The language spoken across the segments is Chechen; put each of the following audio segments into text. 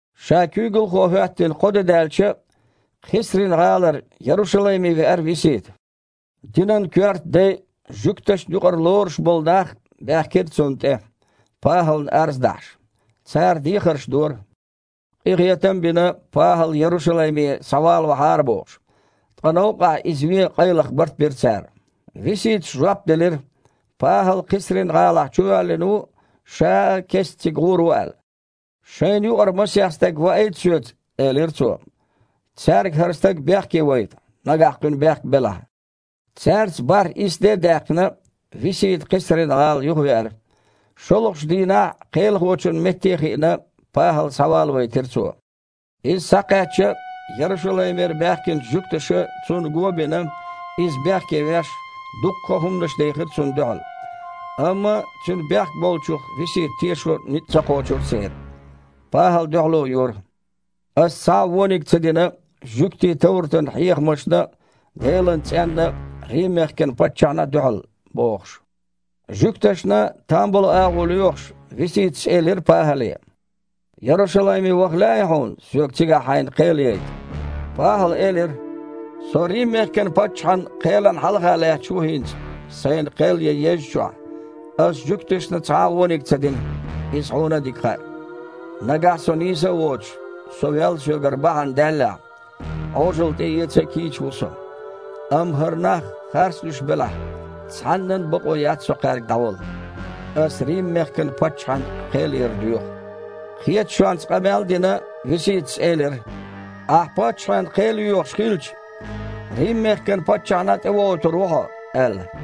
Ша куьйгалхо хІоьттина кхо де даьлча, Кхесрин-гІалара Ярушалайме веара Висита. Динан коьрта дай а, жуьгташна юкъара лоруш болу нах а баьхкира цунна тІе, ПахІална арз дахьаш. Цара дехарш дора, къинхетам а бина, ПахІал Ярушалайме схьавалавахьара бохуш. Ткъа новкъахь иза вен къайлаха барт бира цара. Виситас жоп делира, ПахІал Кхесрин-гІалахь чувоьллина ву, ша а кестта цига гІур ву аьлла. «Шайна юкъара масех стаг ваийта соьца, – элира цо, – цаьрга хІара стаг бехке вайта, нагахь кхуьнан бехк белахь». Цаьрца бархІ-исс де а даьккхина, Висита Кхесрин-гІала юхавеара. ШолгІачу дийнахь, кхелахочун метте а хиъна, ПахІал схьавалавайтира цо. Иза схьакхаьчча, Ярушалаймера баьхкинчу жуьгташа, цунна го а бина, иза бехке веш, дуккха а хІуманаш дехира цунна дуьхьал. Амма цуьнан бехк болчух Висита тешо ницкъ ца кхочура церан. ПахІала дуьхьало йора: «Ас цхьа а вониг ца дина жуьгтийн товратан хьехамашна а, Делан цІенна а, Рим-мехкан паччахьна а дуьхьал», – бохуш. Жуьгташна там болу агІо лоьхуш, Виситас элира ПахІале: «Ярушалайме ваха лаьий хьуна, соьга цигахь хьайна кхел яйта?» ПахІала элира: «Со Рим-мехкан паччахьан кхелана хьалха лаьтташ ву хІинца, сайна кхел ян еззачохь. Ас жуьгташна цхьа а вониг ца дина, иза хьуна а дика хаьа. Нагахь со нийса а воцуш, со вел соьгара бахьана даьллехь, Іожалла тІеэца а кийча ву со. Амма хІара нах харцлуьйш белахь, цхьаннан а бакъо яц со кхаьрга дІавала. Ас Рим-мехкан паччахьан кхел яр доьху». Кхеташонца къамел а дина, Виситас элира: «Ахь паччахьан кхел йоьхуш хилча, Рим-мехкан паччахьна тІевохуьйтур ву хьо», – аьлла.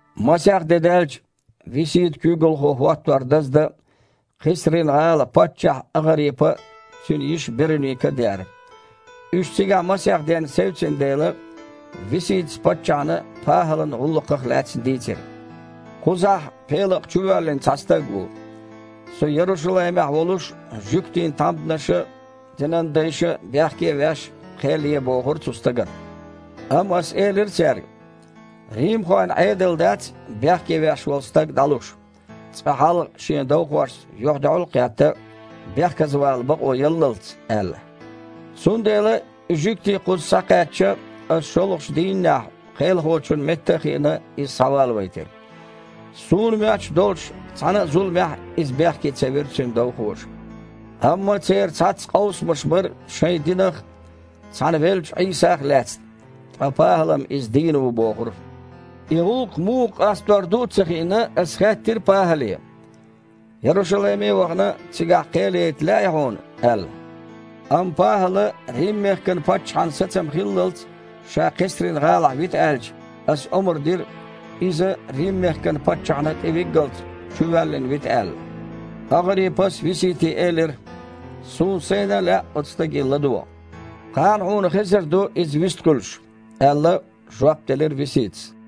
Масех де даьлча, Висита куьйгалхо хІоттор даздан Кхесрин-гІала паччахь АгІарипа а, цуьнан йиша Беруника а деара. Уьш цигахь масех денна севцина дела, Виситас паччахьна ПахІалан гІуллакхах лаьцна дийцира: «Кхузахь Пелакъа чувоьллина цхьа стаг ву. Со Ярушалаймехь волуш жуьгтийн тхьамданаша а, динан дайша а, бехке а веш, кхел е бохура цу стагана. Амма ас элира цаьрга, римхойн Іедал дац бехке веш волу стаг дІалуш, цкъа хьалха шен довхошца юьхь-дуьхьал а кхетта, бехказа вала бакъо яллалц аьлла. Цундела и жуьгтий кхуза схьакхаьчча, ас шолгІачу дийннехь, кхелахочун метте а хиъна, иза схьавалавайтира. Суна моьттуш долчу цхьана а зуламехь иза бехке ца вира цуьнан довхоша. Амма церан цхьацца къовсамаш бара шайн динах а, цхьана веллачу Іийсах а лаьцна, ткъа ПахІала-м Иза дийна ву бохура. И гІуллакх муха къастор ду а ца хиъна, ас хаьттира ПахІале: „Ярушалайме а вахана, цигахь кхел яйта лаьий хьуна?“ – аьлла. Амма ПахІала Рим-мехкан паччахьан сацам хиллалц ша Кхесрин-гІалахь вита аьлча, ас омра дира, иза Рим-мехкан паччахьна тІевиггалц чувоьллина вита аьлла». АгІарипас Висите элира: «Суна сайна а лаьа оцу стаге ладогІа». «Кхана хьуна хезар ду иза вистхуьлуш», – аьлла, жоп делира Виситас.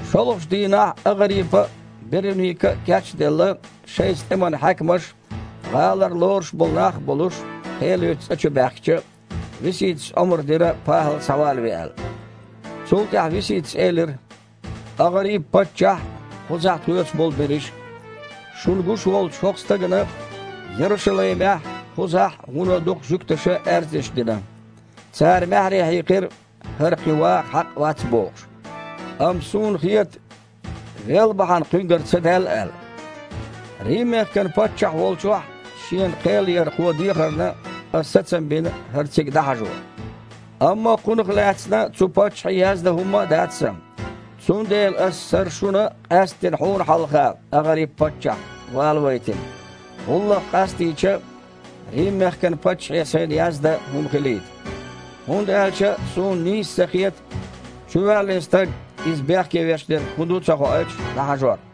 ШолгІачу дийнахь АгІарипа а, Беруника а, кеч а делла, шайца тІеман хьаькамаш а, гІалара лоруш болу нах а болуш кхел ечу цІа чу баьхкича, Виситас омра дира, ПахІал схьавалаве аьлла. Цул тІаьхьа Виситас элира: «АгІарипа-паччахь а, кхузахь тхоьца болу берриш а! Шуна гуш волчу хІокху стагана Ярушалаймехь а, кхузахь а вуно дукха жуьгташа аьрзнаш дина. Цара маьхьарий хьийкхира, хІара кхин ваха хьакъ вац бохуш. Амма суна хета, вел бахьана кхуьнгара ца даьлла аьлла. Рим-мехкан паччахь волчохь шена кхел яр кхо дехарна, ас сацам бина хІара цига дІахьажо. Амма кхунах лаьцна цу паччахье яздан хІумма а дац сан. Цундела ас хІара шуна, къаьсттина хьуна хьалха, АгІарипа-паччахь, валавайтина, гІуллакх къастийча, Рим-мехкан паччахье сайна яздан хІума хилийта. ХІунда аьлча суна нийса ца хета чувоьллина стаг, иза бехке веш дерг хІун ду а ца хоуьйтуш, дІахьажор».